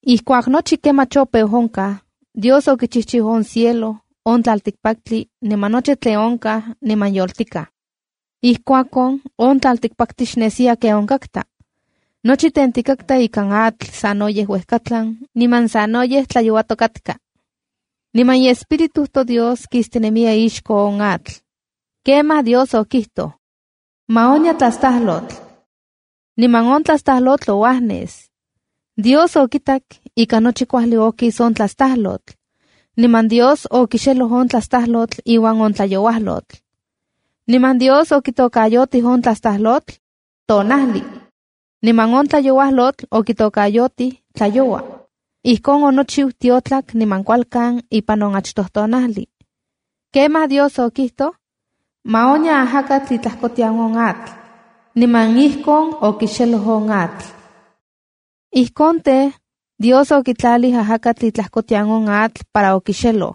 Ijkuak nochi kemach opeu onkaj, Dios okichijchiu on cielo, on tlaltikpaktli niman nochi tlen onkaj niman yoltikaj. Ijkuakon, on tlaltikpaktli xnesiya ken onkatka. Nochi tentikatka ikan atl sanoyej uejkatlan niman sanoyej tlayouatok katka. Niman iEspíritu toDios kistinemiya ixko on atl. Kemaj Dios okijtoj: “¡Ma onya tlastajlotl!” Niman on tlastajlotl ouajnes. Dios okitak ika nochi kuajli okis on tlastajlotl. Niman Dios okixeloj on tlastajlotl iuan on tlayouajlotl. Niman Dios okitokayotij on tlastajlotl “tonajli”, niman on tlayouajlotl okitokayotij “tlayoua”. Ijkon onochiu tiotlak niman kualkan ipan on achtoj tonajli. Kemaj Dios okijtoj: “Ma onya ajakatl itlajkotian on atl.” Niman ijkon okixeloj on atl. Ijkon tej, Dios okitlalij ajakatl itlajkotian on atl para okixeloj.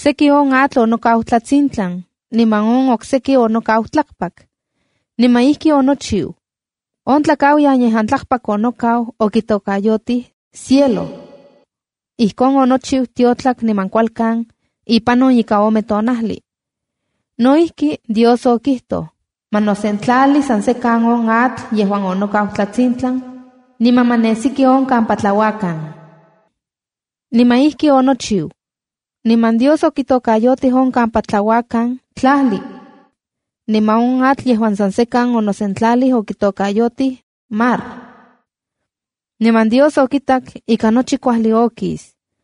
Seki on atl onokau tlatsintlan niman on okseki onokau tlakpak. Niman ijki onochiu. On tlakauyan yejuan tlakpak onokau okitokayotij “cielo”. Ijkon onochiu tiotlak niman kualkan ipan on ika ome tonajli. No ijki, Dios okijtoj: “Ma nosentlali san sekan on atl yejuan onokau tlatsintlan, niman ma nesiki on kampa tlauakan.” Niman ijki onochiu. Niman Dios okitokayotij on kampa tlauakan “tlajli”. Niman on atl yejuan san sekan onosentlalij okitokayotij “mar”. Niman Dios okitak ika nochi kuajli okis.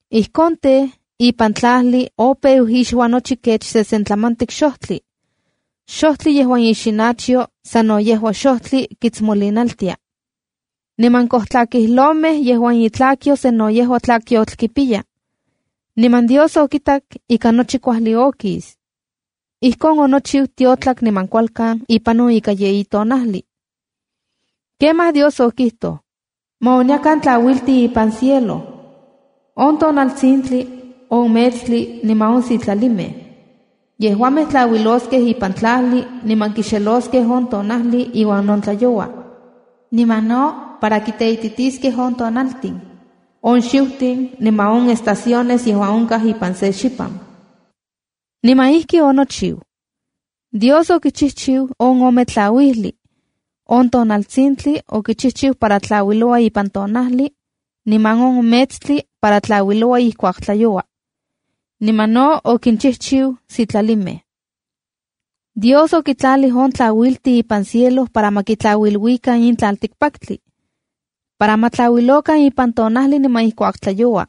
Ijkon tej, ipan tlajli opeu ixua nochi kech sesentlamantik xojtli: xojtli yejuan ixinachyo sano yejua xojtli kitsmolinaltia, niman kojtlakijlomej yejuan itlakyo sano yejua tlakyotl kipiya. Niman Dios okitak ika nochi kuajli okis. Ijkon onochiu tiotlak niman kualkan ipan on ika yeyi tonajli. Kemaj Dios okijtoj: “Ma onyakan tlauiltin ipan cielo: on tonaltsintli, on metstli niman on sitlalimej. Yejuamej tlauiloskej ipan tlajli niman kixeloskej on tonajli iuan on tlayoua, niman no para kiteititiskej on tonaltin, on xiutin niman on estaciones yejuan onkaj ipan se xipan.” Niman ijki onochiu. Dios okichijchiu on ome tlauijlij. On tonaltsintli okichijchiu para tlauiloua ipan tonajli, niman on metstli para tlauiloua ijkuak tlayoua. Niman no okinchijchiu sitlalimej. Dios okintlalij on tlauiltin ipan cielo para ma kitlauiluikan in tlaltikpaktli, para ma tlauilokan ipan tonajli niman ijkuak tlayoua,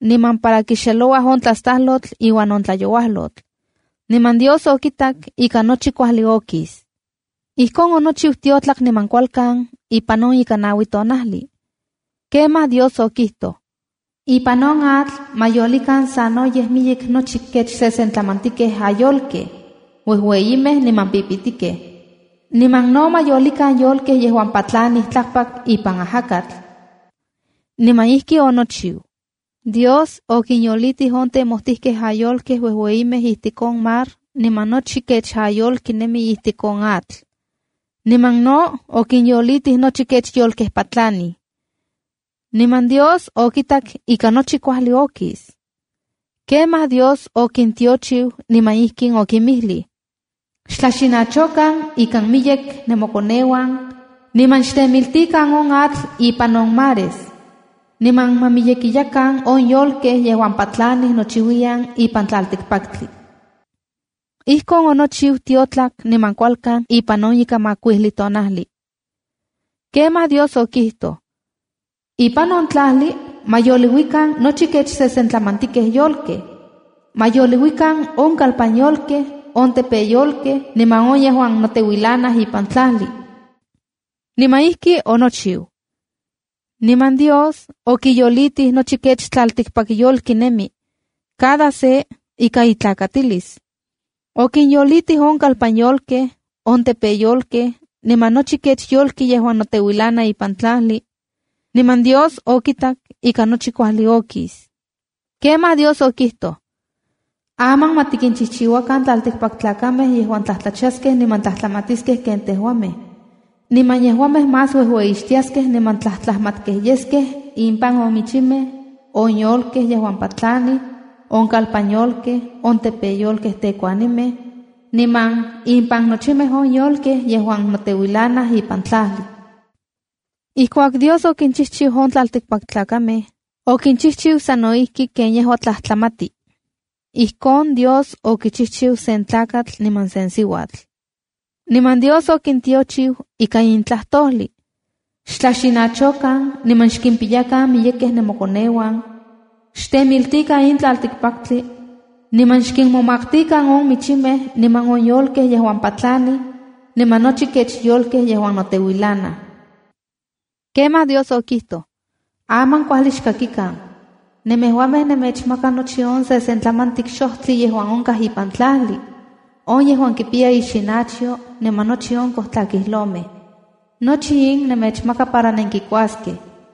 niman para kixelouaj on tlastajlotl iuan on tlayouajlotl. Niman Dios okitak ika nochi kuajli okis. Ijkon onochiu tiotlak niman kualkan ipan on ika naui tonajli. Kemaj Dios okijtoj: “Ipan on atl ma yolikan sanoyej miyek nochi kech sesentlamantikej ayolkej, uejueyimej niman pipitikej. Niman no ma yolikan yolkej yejuan patlanij tlakpak ipan ajakatl.” Niman ijki onochiu. Dios okinyolitij on temojtijkej ayolkej uejueyimej ijtik on mar, niman nochi kech ayolki nemi ijtik on atl. Niman no, okinyolitij nochi kech yolkej patlanij. Niman Dios okitak ika nochi kuajli okis. Kemaj Dios okintiochiu niman ijkin okinmijlij: “Xtlaxinachokan ikan miyek nemokoneuan niman xtemiltikan on atl ipan on mares. Niman ma miyekiyakan on yolkej yejuan patlanij nochiuiyan ipan tlaltikpaktli.” Ijkon onochiu tiotlak niman kualkan ipan on ika makuijli tonajli. Kemaj Dios okijtoj: “Ipan on tlajli ma yoliuikan nochi kech sesentlamantikej yolkej. Ma yoliuikan on kalpan yolkej, on tepeyolkej niman on yejuan noteuilanaj ipan tlajli.” Niman ijki onochiu. Niman Dios okiyolitij nochi kech tlaltikpakyolki nemi, cada se ika itlakatilis. Okinyolitij on kalpan yolkej, on tepeyolkej niman nochi kech yolki yejuan noteuilana ipan tlajli. Niman Dios okitak ika nochi kuajli okis. Kemaj Dios okijtoj: “Aman ma tikinchijchiuakan tlaltikpaktlakamej yejuan tlajtlachaskej niman tlajtlamatiskej ken tejuamej, niman yejuamej más uejueyixtiaskej niman tlajtlajmatkej yeskej ipan on michimej, on yolkej yejuan patlanij, on kalpan yolkej, on tepeyolkej tekuanimej, niman ipan nochimej on yolkej yejuan noteuilanaj ipan tlajli.” Ijkuak Dios okinchijchiu on tlaltikpaktlakamej, okinchijchiu sa no ijki ken yejua tlajtlamati. Ijkon Dios okichijchiu sen tlakatl niman sen siuatl. Niman Dios okintiochiu ika in tlajtojli: “Xtlaxinachokan niman xkimpiyakan miyekej nemokoneuan. Xtemiltikan in tlaltikpaktli, niman xkinmomaktikan on michimej, niman on yolkej yejuan patlanij, niman nochi kech yolkej yejuan noteuilanaj.” Kemaj Dios okijtoj: “Aman kuajli xkakikan. Nemejuamej nemechmaka nochi on sesentlamantik xojtli yejuan onkaj ipan tlajli, on yejuan kipiya ixinachyo niman nochi on kojtlakijlomej. Nochi in nemechmaka para nenkikuaskej.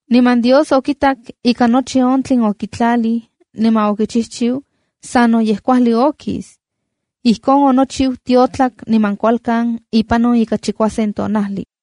Niman Dios okitak ika nochi on tlen okitlalij niman okichijchiu sanoyej kuajli okis. Ijkon onochiu tiotlak niman kualkan ipan on ika chikuasen tonajli.